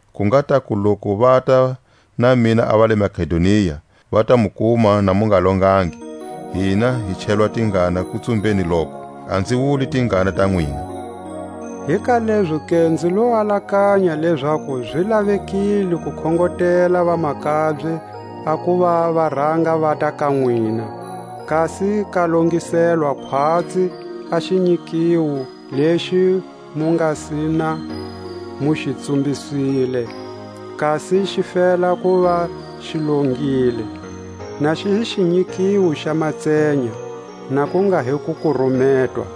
ku nga taku loku vata na mina a va le Makedonia, va ta mu kuma na mu nga longangi, hina hi chelwa tingana kutsumbeni loku, a nzi wuli tingana ta nwina. Hi ka lezoke nzi lo alakanya lezaku zi lavekile ku khongotela vamakabye a kuva va ranga vata ka nwina, kasi ka longiselwa khwatsi a xinyikiwo lexi mu nga si na mu xi tsumbisile, kasi xi fela kuva xi longile, na xi hi xinyikiwo xa matsenya, na ku nga hi ku kurumetwa.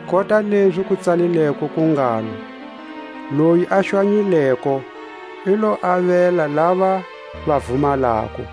Kota lezi ku tsalilweko ku ngalo: Loyi a xwanyileko, i lo avela lava va vumalako;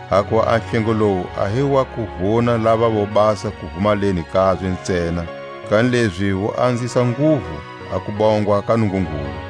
Hakuva a hlengo lowu a hi wa ku vuna lava vobasa kuvumaleni kabye ntsena, kanilezi wu anzisa nguvu a kubongwa ka Nungungulu.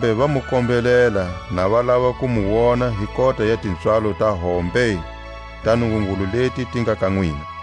Kambe va mu kombelela na va lava ku mu wona hi kota ya tipswalo ta hombe ta Nungungulu leti ti nga ka nwina.